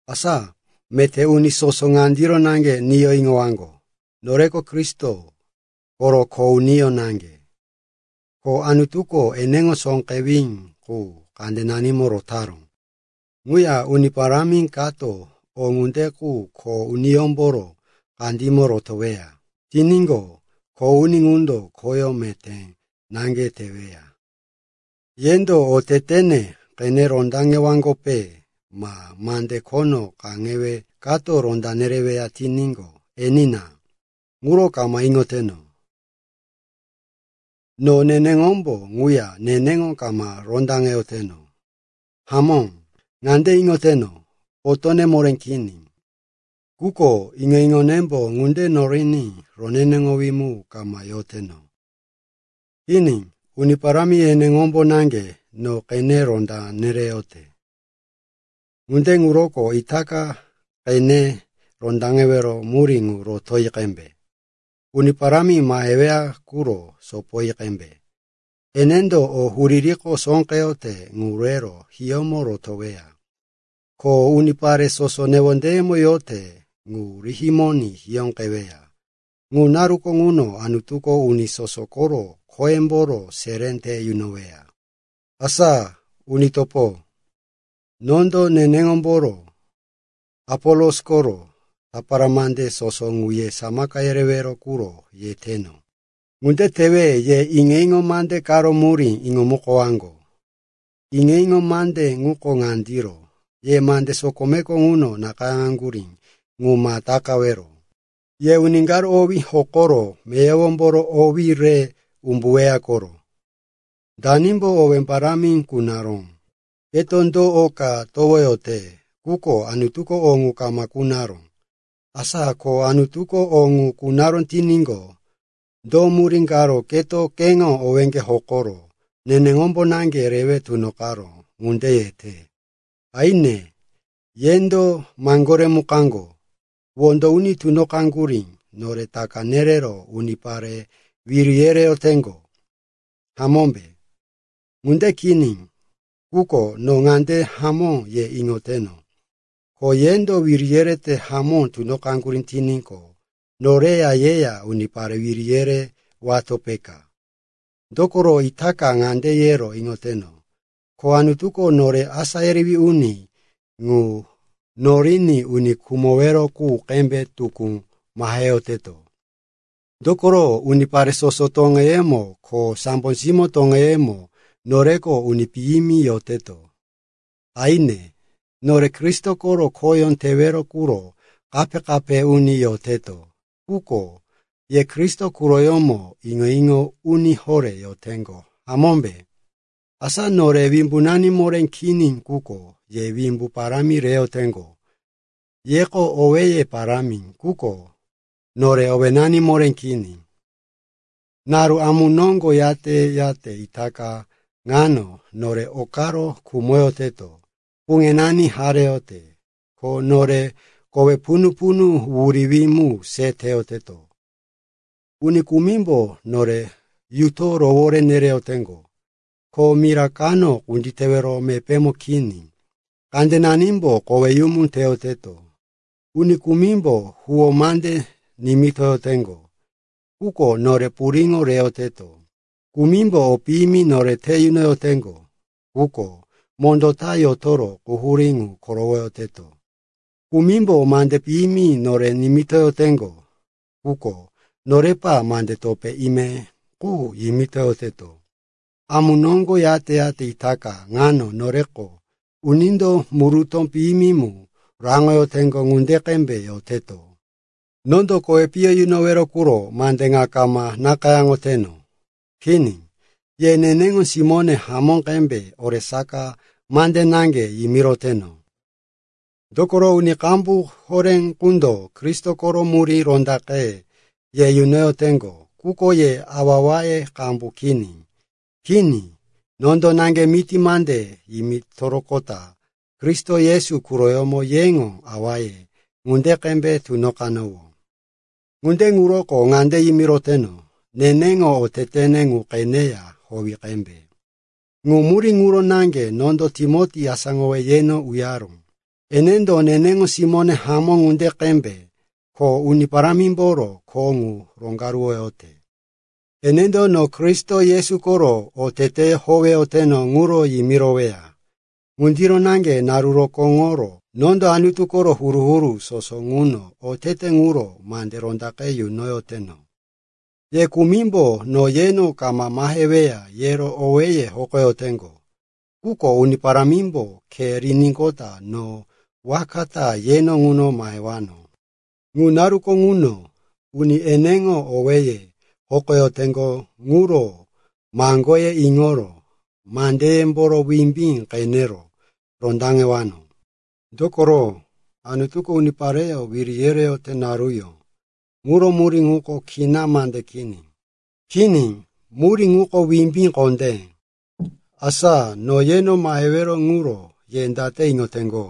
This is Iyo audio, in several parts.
Asa meté uni soso ŋandiro naŋge niyo iŋowaŋgo, noreko Kristo koro kho uniyó naŋge, ko Anutuko eneŋo sóqewí qu kandenanimo rotaró. Ŋuya, uni parámi kato o ŋunde qu kho uniyómboro kandímo rotoweya tiníqo, kho uni ŋundo khoyó meté naŋge teweya. Yendo otetene qene rondaŋewaŋgope ma mande khono kaŋewe kato ronda nereweya tiníqo, enina. Ŋuro kama iŋoteno. No neneŋombo ŋuya neneŋo kama rondaŋeyoteno. Hamó, ŋande iŋoteno, potóne moré kini. Quko iŋo-iŋonembo ŋunde noriní roneneŋowí mu kama yoteno. Kini, Uni Parámi eneŋombo naŋge no qene ronda nereyote. Ŋunde ŋuroko itaka qene rondaŋewero murí ŋu rotoyi qembe. Uni Parámi maheweya quro sopoyi qembe. Enendo o huririko sóqeyote ŋu rero hiyómo rotoweya, ko unipare soso newondeyemo yote ŋu rihimoní hiyóqeweya. Ŋu naruko ŋuno Anutuko uni soso koro khoyemboro seré te yunoweya. Asa, uni topo, nondo nenemboro, Apolos koro, tapara mande soso ŋu ye samaka yerewero quro yeteno. Ŋunde tewe ye iŋo-iŋo mande karo murí iŋomukowaŋgo. Iŋo-iŋo mande ŋuko ŋandiro, “Ye mande sokomeko ŋuno nakayáŋaŋgurí ŋu ma takawero.” Ye uni karo owí hokoro meyowomboro owí re umbuweya koro. Danimbo owé parámi kunaró? Keto do oka towoyote quko Anutuko o ŋu kama kunaró? Asa ko Anutuko o ŋu kunaró tiníqo, do murí karo keto keŋo owéŋge hokoro, neneŋombo naŋge rewe tunoqaró, ŋunde yete? Aine, yendo maŋgoremukaŋgo, wondo uni tunoqaŋgurí, nore taka nerero unipare wiri yereyoteŋgo, hamómbe? Ŋunde kini, quko no ŋande hamó ye iŋoteno, ko yendo wiri yerete hamó tunoqaŋgurí tiníqo, noreya yeya unipare wiri yerewato, peka. Dokoro itaka ŋande yero iŋoteno, ko Anutuko nore, asá yerewí uni ŋu, noriní uni khumowero qu qembe tukú maheyoteto. Dokoro unipare soso toŋeyemo ko sambo simó toŋeyemo noreko uni piyimi yoteto. Aine, nore Kristo koro khoyó tewero quro kape-kape uni yoteto, quko ye Kristo quroyómo iŋo-iŋo uni horé yoteŋgo, hamómbe? Asa nore wimbunani moré kini, quko ye wimbu parámi reyoteŋgo. Yeko owéye parámi, quko nore owénani moré kini. Naru amu noŋgo yate-yate itaka ŋano, nore o koro khumoyoteto, puŋenani hareyote ko nore kowe punu-punu wuriwí mu se teyoteto. Uni kumimbo nore yuto rowore nereyoteŋgo, ko mira kano kunditewero mepémo kini. Kandenanimbo koweyumu teyoteto. Uni kumimbo huwó mande nimitoyoteŋgo, quko nore puriŋo yereyoteto. Kumimbo o piyimi nore te yunoyoteŋgo, quko mondó ta yotoro quhurí ŋu korowoyoteto. Kumimbo mande piyimi nore nimitoyoteŋgo, quko norepa mande topé ime qu yimitoyoteto. Amu noŋgo yate-yate itaka ŋano noreko unindo murutó piyimi mu raŋoyoteŋgo ŋunde qembe yoteto. Nondo kowi piyo yunowero quro mande ŋa kama nakayáŋoteno. Kini, ye neneŋo simóne hamó qembe oresaka mande naŋge yimiroteno. Dokoro uni qambu horé ŋundo Kristo koro murí rondaqe ye yunoyoteŋgo, quko ye awa-awaye qambu kini. Kini, nondo naŋge miti mande yimitoroqota Kristo Yesu quroyómo yeŋo awaye ŋunde qembe tunoqanowó. Ŋunde ŋuroko ŋande yimiroteno, neneŋo otetene ŋu qeneya howi qembe. Ŋu murí ŋuro naŋge nondo Timoti asáŋowe yeno uyaró. Enendo neneŋo simóne hamó ŋunde qembe, ko Uni Parámimboro kho ŋu roŋgaruwoyote. Enendo no Kristo Yesu koro oteteyó howeyoteno ŋuro yimiroweya. Ŋundiro naŋge naru rokóŋo nondo Anutu koro huru-huru soso ŋuno otete ŋuro mande rondaqe yunoyoteno. Ye kumimbo no yeno kama maheweya, yero owéye hokoyoteŋgo. Quko Uni Parámimbo khe riníqota no waka ta yeno ŋuno mahewano. Ŋu naruko ŋuno, uni eneŋo owéye hokoyoteŋgo ŋuro maŋgoye iŋoro mandeyemboro wimbí qenero rondaŋewano. Dokoro, Anutuko unipareyó wiri yereyote naruyó ŋuro murí ŋuko kina mande kini. Kini, murí ŋuko wimbí kondé. Asa no yeno mahewero ŋuro ye date iŋoteŋgo?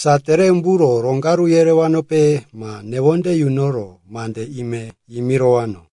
Saté re umburo roŋgaru yerewanope ma newonde yunoro mande ime yimirowano?